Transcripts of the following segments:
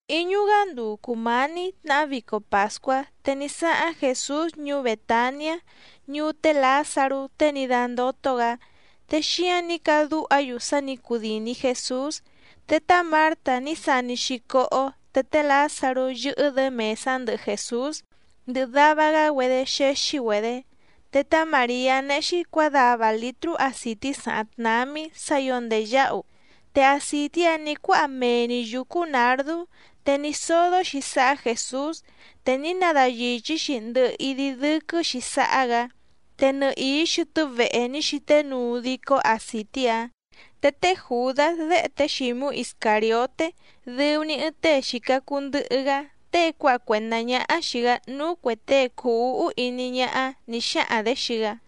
Íñú‑gá nduu cùmání tnahá vico pàscuá, te ní sáháⁿ Jèsús ñuú Bètaniá, ñuú té Lǎzarú tée ní dándótó‑gǎ. Te xíáⁿ nǐ cadúha‑yu sá nǐ cudìni Jesús. Te tá Mǎrta ní sani‑xi cóhó, te té Lǎzarú yɨ́hɨ́‑dě mèsá ndɨhɨ Jèsús, ndɨhɨ dava‑gá‑güedé xéxí‑güedě. Te tá Màriá néhé‑xí cuǎdava lǐtrú acìtí sàháⁿ tnámí sǎ ǐo ndèyáhu, te acìtí‑áⁿ nǐ cuáha mee‑ni yǔcú nǎrdú, te ní sódó‑xi sáhá Jèsús, te ní nadayìchí‑xi ndɨhɨ idi dɨ́quɨ́‑xi sáhá‑gǎ. Te nɨhìí xɨtɨ́ vehe ní xíté nuu dicó acìtí‑áⁿ. Te té Jùdás déhe té Xǐmú Iscàrioté dɨu‑ni ɨɨⁿ tée xìca cuu ndɨhɨ‑gá, tée cuáha cuèndá ñáhá xìi‑gá núú cuè tée cùu úhú iní ñáhá nǐ xáhaⁿ‑dě xii‑gá: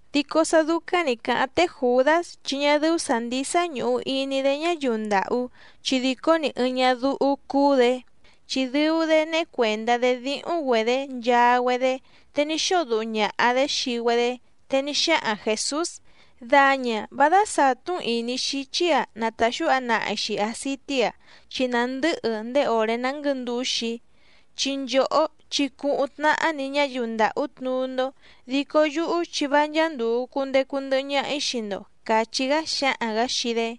Dico sá dúcáⁿ nǐ cáháⁿ té Jùdás chi ñá dɨ́ú sǎ ndísá ñùhu iní‑dé ñáyiu ndàhú chi dìcó‑ni ɨɨⁿ ñádúhú cúú‑dě, chi dɨu‑dé néhé cuèndá‑dé díhúⁿ‑güedě nchaa‑güedé te ní xóo duhu ñàha‑dé xii‑güedé. Te ní xáhaⁿ Jèsús: —Daña, vá dásàtú‑n ìní xíchí‑a na tàxúha nahi‑xi àcití‑a, chi nàndɨ́hɨ ndéé òré ná nguɨ̌ndǔxi‑í. Chi nchòhó chi cuhuⁿ tnahá‑ni ñáyiu ndàhú tnuú‑ndó, dico yúhú chi vá ncháá ndùu cundecu ndɨhɨ ñaha‑í xii‑ndo —càchí‑gá xáhaⁿ‑gǎ xii‑dé.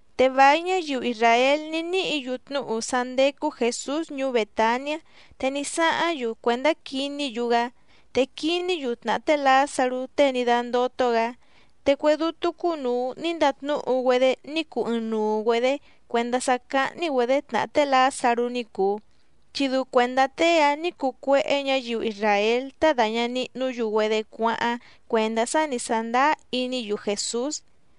Te vài ñáyiu isràél ní níhǐ‑yu tnúhu sá ndécú Jèsús ñuú Bètaniá. Te ní sáháⁿ‑yu cuèndá quiní‑yu‑gá, te quiní‑yu tnàhá té Lǎzarú tée ní dándótó‑gǎ. Te cue dútú cúnùu ní ndatnúhu‑güedé ní cuu ɨɨⁿnuu‑güedě cuèndá sá cáhní‑güedě tnàhá té Lǎzarú ní cùu, chi dɨu cuèndá tée‑áⁿ nǐ cuu cuéhé ñǎyiu isràél tá dàña nihnú‑yu‑güedé cuáháⁿ cuèndá sá nǐ sándáá iní‑yu Jèsús.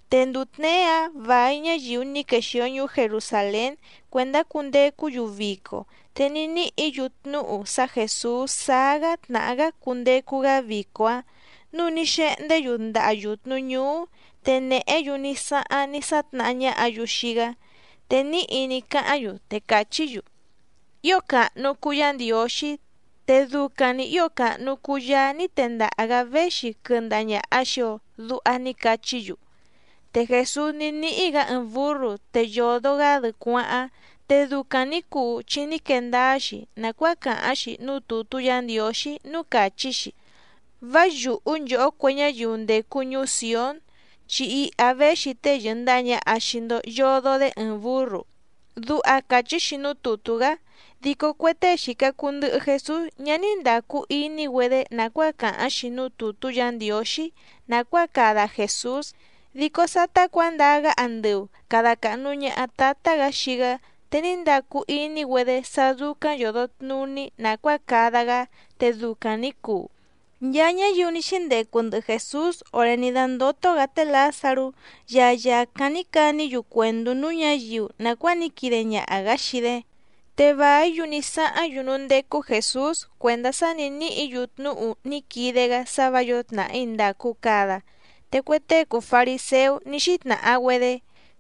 Te nduu tněé‑áⁿ vài ñáyiu ní quexìo ñuú Jerusàlén cuèndá cundecú‑yu vico, te ní níhǐ‑yu tnúhu sá Jèsús sáá‑gá tnàhá‑gá cundecu‑gá vico‑áⁿ, núu ní xehndé‑yu ndaha yùtnu ñúú, te nèhé‑yu ní sáháⁿ ní sátnahá ñáhǎ‑yu xii‑gá. Te níhi ní cáháⁿ‑yu, te càchí‑yu: —¡Ío càhnu cuu Yá Ndiǒxí! Te ducaⁿ‑ni ǐo càhnu cuu Yaá ní tendaha‑gǎ véxi quɨndaha ñàha xii‑o —duha ní cachí‑yu. Te Jèsús ní níhí‑gǎ ɨɨⁿ bǔrru, te yòdo‑gá‑dɨ cuáháⁿ. Te ducaⁿ nǐ cuu chi ní quee ndáá‑xi nàcuáa càháⁿ‑xi núú tùtú Yǎ Ndiǒxí núú càchí‑xi: Vá yùhú nchòhó cue ñáyiu ndècu ñuú Sìón, chi iha véxi tée yɨ̀ndaha ñaha xii‑ndo yodo‑dé ɨɨⁿ bǔrru. Duha càchí‑xi núú tùtú‑gá. Dico cue tée xìca cuu ndɨhɨ Jesús ñá ní ndàcu iní‑güedé nàcuáa càháⁿ‑xi núú tùtú Yǎ Ndiǒxí nàcuáa cada Jèsús. Dico sátá cuǎndaa‑gá andɨu càda cahnu ñaha Tátá‑gǎ xii‑gá, te ní ndacu iní‑güedé sá dúcáⁿ yòdo tnuní nàcuáa cada‑gá, te ducaⁿ nǐ cuu. Nchaa ñáyiu ní xíndecu ndɨhɨ Jèsús òré ní dándótó‑gǎ té Lǎzarú, ya yàcáⁿ ní caní‑yu cuèndú núú ñǎyiu nàcuáa ní quide ñaha‑gǎ xii‑dé. Te vàí‑yu ní sáháⁿ‑yu núú ndécú Jèsús cuèndá sá nǐ níhǐ‑yu tnúhu ní quide‑gá sá vǎ yǒo tnàhí ndàcu cada. Te cue tée cùu fariséú ní xítnàha‑güedé: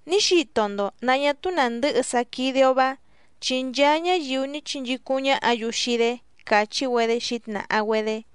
—Ní xito‑ndo nǎ ñá túú nàndɨhɨ sá quídé‑ó‑vá, chi nchaa ñáyiu ní chinchícúⁿ ñáhǎ‑yu xii‑dé —càchí‑güedé xǐtnàha‑güedé.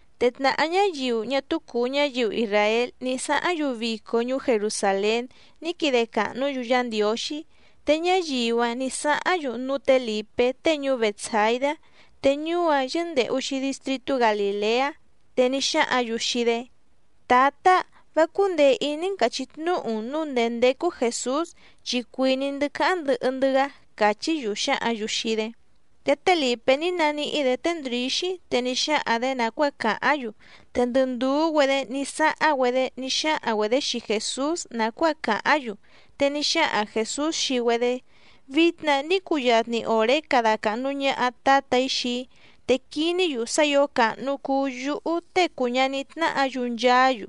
Te tnàhá ñáyiu ñá túú cùu ñáyiu isràél ní sáháⁿ‑yu vico ñuú Jerusàlén ní quide càhnú‑yu Yá Ndiǒxí. Te ñáyiu‑áⁿ nǐ sáháⁿ‑yu núú tě Lìpé tée ñuú Bètsaidá, te ñuú‑áⁿ yɨ́ndèhu‑xi distritú Galìleá. Te ní xáhǎⁿ‑yu xii‑dé: —Tǎtá, vá cúndèe iní‑n càchí tnúhu‑n nǔu ndèé ndécú Jèsús, chi cuìní‑ndɨ́ cáháⁿ ndɨhɨ‑ndɨ́‑gá —càchí‑yu xǎhǎⁿ‑yu xii‑dé. Te té Lìpé ní naníhí‑dě té Ndrǐxí te ní xáhaⁿ‑dě nàcuáa càháⁿ‑yu, te ndɨ ndùú‑güedé ní sáháⁿ‑güedé ní xáhaⁿ‑güedě xii Jèsús nàcuáa càháⁿ‑yu. Te ní xáhaⁿ Jèsús xii‑güedé: —Vitna ní cuyatni òré cada càhnu ñaha Tátà‑í xii‑í, te quiní‑yu sá ǐo càhnu cuu yúhú Tée cùu ñaní tnáhǎ‑yu nchaá‑yu.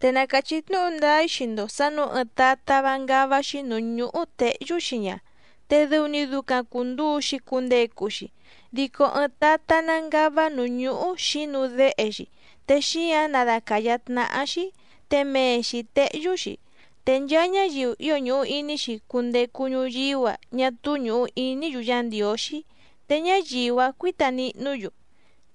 Te na càchí tnúhu ndáá‑í xii‑ndo sǎ nǔu ɨɨⁿ tatá vá ngává‑xí nǔú ñúhú těhyú‑xi ña, te dɨu‑ni ducaⁿ cùnduu‑xi cundecu‑xi. Dico ɨɨⁿ tatá ná ngává nǔú ñúhú xǐnu déhe‑xi, te xíǎⁿ nádàcayá tnáhá‑xí, te mee‑xi tèhyú‑xi. Te nchaa ñáyiu ío ñùhu iní‑xi cundecu ñuyíú‑a ñá túú ñùhu iní‑yu Yá Ndiǒxí, te ñáyiu‑áⁿ cuǐta nihnú‑yu.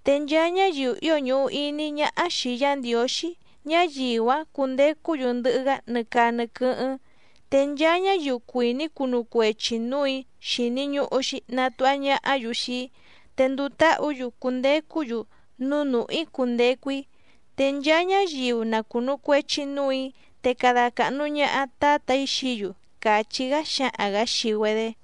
Te nchaa ñáyiu ío ñùhu iní ñáhá xìi Yá Ndiǒxí, ñáyiu‑áⁿ cundecú‑yu ndɨhɨ‑gá nɨ caa nɨ quɨ́hɨ́ⁿ. Te nchaa ñáyiu cuìní cunu cuechi nǔù‑í xìni ñuhu‑xi natuha ñahá‑yu xii‑í, te nduu táhǔ‑yu cundecú‑yu núú nùhú‑í cundecu‑í. Te nchaa ñáyiu na cùnu cuechi núù‑í, te cada càhnu ñaha Tátà‑í xií‑yu —càchí‑gá xáhaⁿ‑gǎ xii‑güedé.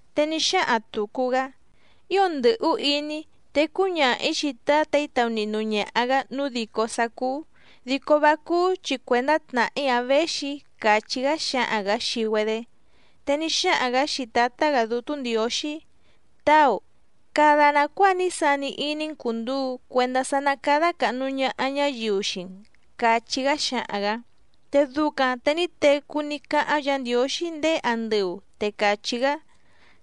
Te ní xáhaⁿ tùcu‑gá: —Ío ndɨ̀hú iní‑í. Te cúñaha‑ǐ xii Tǎtà‑í taunihnu ñaha‑gǎ nǔu dìcó sá cúú, dico vá cúú chi cuèndá tnàhí‑a véxi‑í —càchí‑gá xáhaⁿ‑gǎ xii‑güedé. Te ní xáhaⁿ‑gǎ xii Tǎtá‑gǎ Dútú Ndiǒxí: —Táu, cada nàcuáa ní sani iní‑n cùnduu cuendá sá ná cádá càhnu ñaha ñáyiu xii‑n —càchí‑gá xáhaⁿ‑gǎ. Te ducaⁿ te ní tecú ní cáháⁿ Yǎ Ndiǒxí ndéé andɨu, te càchí‑gá: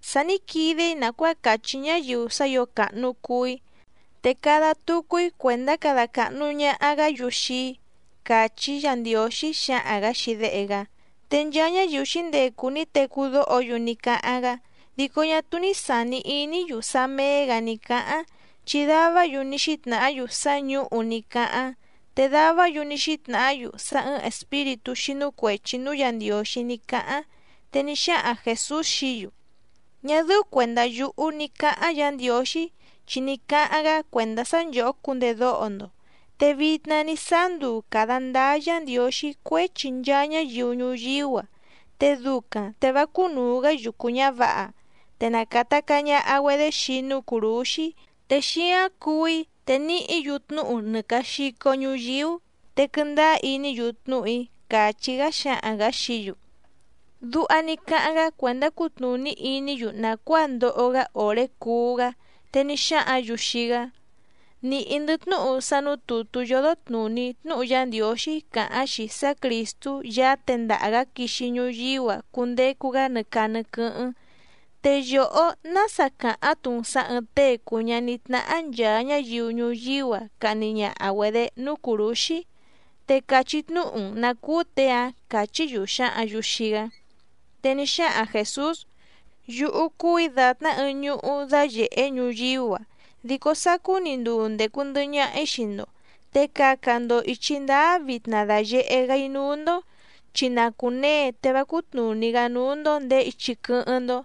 —Sa ní quide‑í nàcuáa cachí ñáyiu sá ǐo càhnu cuu‑í. Te cada tucu‑í cuèndá cada càhnu ñaha‑gá‑yu xii‑í —càchí Yǎ Ndiǒxí xáhaⁿ‑gǎ xii Déhe‑gá. Te nchaa ñáyiu xǐndecu ní tecú dóho‑yu ní cáháⁿ‑gá, dico ñá túú ní sàni iní‑yu sá méé‑gǎ ní cáháⁿ, chi davá‑yu ní xítnàhá‑yu sá ñǔhu ní cáháⁿ, te davá‑yu ní xítnàhá‑yu sá ɨ̀ɨⁿ espíritú xínú cuèchi núú Yǎ Ndiǒxí ní cáháⁿ. Te ní xáhaⁿ Jèsús xií‑yu: —Ñá dɨ́ú cuèndá yúhú ní cǎháⁿ Yǎ Ndiǒxí, chi ní cáháⁿ‑gá cuèndá sá nchòhó cundedóho‑ndo. Te vitna ní sáá nduu càda ndáá Yǎ Ndiǒxí cuéchi nchaa ñáyiu ñuyíú‑a, te ducaⁿ te vá cúnùu‑gá yucu ñǎvǎha. Te na càta caa ñaha‑güedé xii‑í núú cùrúxí, te xíáⁿ cuú‑í te níhǐ‑yu tnúhu nɨ càa xico ñuyíú, te quɨndáá iní‑yu tnúhu‑í —càchí‑gá xáhaⁿ‑gǎ xií‑yu. Duha ní cáháⁿ‑gá cuèndá cutnùní iní‑yu nàcuáa ndoho‑gá òré cuú‑gá. Te ní xáhǎⁿ‑yu xii‑gá: —Nìhí‑ndɨ́ tnúhu sá nǔú tùtú yódó tnùní tnúhu Yá Ndiǒxí càháⁿ‑xi sá Crìstú Yaá tendaha‑gǎ quixi ñuyíú‑a cundecu‑gá nɨ caa nɨ quɨ́hɨ́ⁿ. ¿Te yòhó nása càháⁿ‑tu‑n sǎ ɨ̀ɨⁿ tée cùu ñaní tnáhá nchàa ñáyiu ñuyíú‑a cahni ñaha‑güedě núú cùrúxí? Te cachí tnúhu‑n nǎ cúú těe‑áⁿ —càchí‑yu xǎhǎⁿ‑yu xii‑gá. Te ní xáhaⁿ Jèsús: —Yúhú cúù‑í dàtná ɨɨⁿ ñuhú dáyèhé ñuyíú‑a, dico sacú‑ni nduu ndècu ndɨhɨ ñaha‑í xii‑ndo. Te caca‑ndo ìchi ndáá vitna dàyehé‑gá‑í núú‑ndó chi na cùnee te vá cútnùní‑gá núú‑ndó ndèé ichi quɨ́hɨ́ⁿ‑ndó.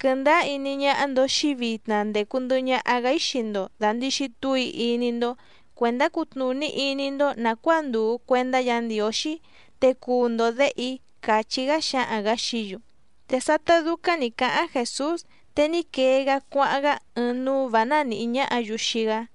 Quɨndáá iní ñáhá‑ndó xìi‑í vitna ndècu ndɨhɨ ñaha‑gá‑í xii‑ndo dàndixi túu‑í iní‑ndó, cuèndá cutnùní iní‑ndó nàcuáa ndùu cuendá Yǎ Ndiǒxí, te cuu‑ndo děhe‑í —càchí‑gá xáhaⁿ‑gǎ xií‑yu. Te sátá dúcáⁿ nǐ cáháⁿ Jèsús, te ní quee‑gá cuáháⁿ‑gá ɨɨⁿ núú vǎ ná nìhí ñáhǎ‑yu xii‑gá.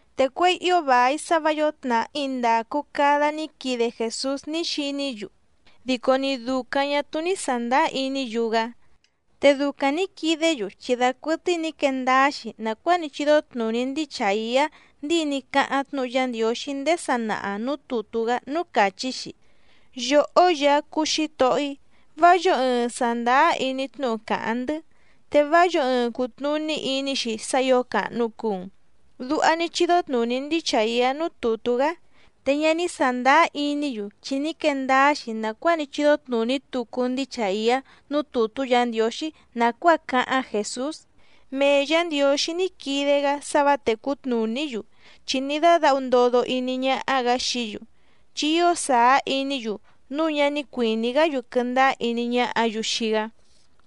Te cuěi ío vài sá vǎ yǒo tnàhí ndàcu cada ní quide Jèsús ní xiní‑yu, dico ni dùcaⁿ ñá túú ní sàndáá iní‑yu‑gá. Te ducaⁿ nǐ quidé‑yu chi dacuɨtɨ́í nǐ quee ndáá‑xi nàcuáa ní chídó tnùní ndíi Chàiá ndíi ní cáháⁿ tnúhu Yá Ndiǒxí ndéé sanaha nǔú tùtú‑gá núú càchí‑xi: Yòhó Yaá cúú Xǐtohó‑í, vá yǒo ɨɨⁿ sàndáá iní tnúhu càháⁿ‑ndɨ́. Te vá yǒo ɨɨⁿ cùtnuní iní‑xi sá ǐo càhnu cuu‑n. Duha ní chídó tnùní ndíi Chàiá núú tùtú‑gá. Te ñá ní sàndáá iní‑yu chi ní quee ndáá‑xi nàcuáa ní chídó tnùní tucu ndíi Chàiá núú tùtú Yǎ Ndiǒxí nàcuáa cáháⁿ Jèsús: Mee Yǎ Ndiǒxí ní quide‑gá sá vǎ tècú tnùní‑yu, chi ní dádǎhu ndodo iní ñáhá‑gǎ xií‑yu, chi ío sàá iní‑yu núu ñá ní cuìní‑gá‑yu quɨndáá iní ñáhǎ‑yu xii‑gá.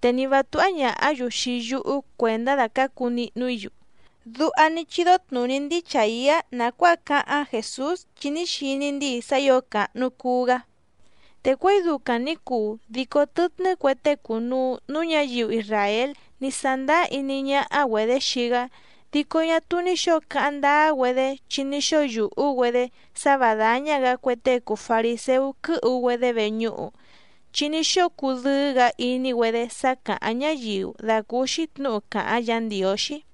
Te ni vǎ túhá ñàhá‑yu xii yúhú cuèndá dacǎcu nihnu‑í‑yu. Duha ní chídó tnùní ndíi Chàiá nàcuáa cáháⁿ Jèsús chi ní xiní ndíi sá ǐo càhnu cuu‑gá. Te cuěi ducaⁿ nǐ cuu dico tɨtnɨ́ cue tée cùnuu núú ñǎyiu isràél ní sándáá iní ñáhá‑güedě xii‑gá. Dico ñá túú ní xǒo cáháⁿ ndáá‑güedé chi ní xóo yùhú‑güedé sá vǎ dáñá‑gǎ cue tée cùu fariséú quɨ́hu‑güedé veñúhu. Chi ní xóo cudɨ́ɨ́‑gǎ iní‑güedé sá càháⁿ ñáyiu dàcúúxí tnǔhu càháⁿ Yǎ Ndiǒxí.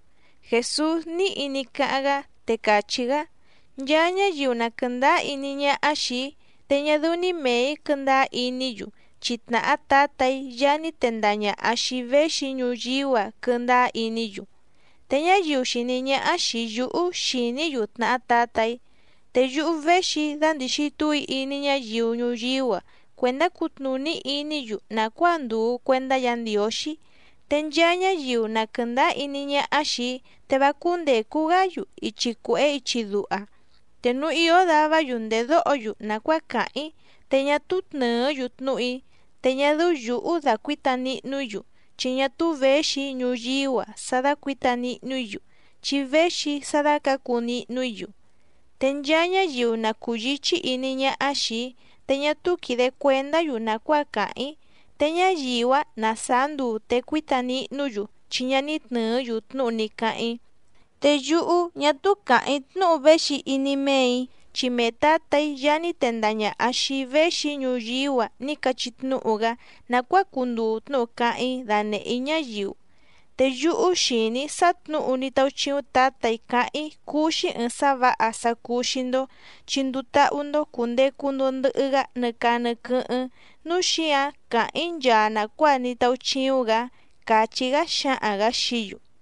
Jèsús níhi ní cáháⁿ‑gá, te càchí‑gá: —Nchaa ñáyiu na quɨ̀ndáá iní ñáhá xìi‑í, te ñá dɨ́ú‑ní mèe‑í quɨ́ndáá iní‑yu, chi tnàhá Tǎtà‑í Yaá ní tendaha ñàha xii‑í véxi‑í ñuyíú‑a quɨndáá iní‑yu. Te ñáyiu xìní ñáhá xìi yúhú xìní‑yu tnàhá Tǎtà‑í. Te yúhú véxi‑í dandìxi túu‑í iní ñáyiu ñuyíú‑a cuèndá cutnùní iní‑yu nàcuáa ndùu cuendá Yǎ Ndiǒxí, te nchaa ñáyiu na quɨ̀ndáá iní ñáhá xìi‑í te vá cúndècu‑gá‑yu ichi cuèhé ichi duha. Te núu ìó davá‑yu ndèdóho‑yu nàcuáa càháⁿ‑í te ñá túú tnɨ̀ɨ́‑yu tnúhu‑í, te ñá dɨ́ú yǔhú dàcuíta nihnu‑í‑yu, chi ñá túú věxi‑í ñuyíú‑a sá dácuǐta nihnu‑í‑yu, chi véxi‑í sá dácǎcu nihnu‑í‑yu. Te nchaa ñáyiu na cùyíchí iní ñáhá xìi‑í te ñá túú quìde cuendá‑yu nàcuáa càháⁿ‑í, te ñáyiu‑áⁿ ná sàá nduu te cuíta nihnú‑yu chi ñá ní tnɨ̀ɨ́‑yu tnúhu ní cáháⁿ‑í. Te yúhú ñá túú càháⁿ‑í tnúhu véxi iní méè‑í, chi mee Tǎtà‑í Yaá ní tendaha ñàha xii‑í véxi‑í ñuyíú‑a ní cachí tnúhu‑gá nàcuáa cunduu tnúhu cáháⁿ‑í danèhé‑í ñáyiu. Te yúhú xìní‑í sá tnǔhu ní táúchíúⁿ Tǎtà‑í cáháⁿ‑í cúú‑xí ɨ̀ɨⁿ sá vǎha sá cúú xìi‑ndo chi nduu táhú‑ndó cùndecu‑ndo ndɨhɨ‑gá nɨ caa nɨ quɨ́hɨ́ⁿ, núu xíǎⁿ càháⁿ‑í nchaa nàcuáa ní táúchíúⁿ‑gǎ —càchí‑gá xáhaⁿ‑gǎ xií‑yu.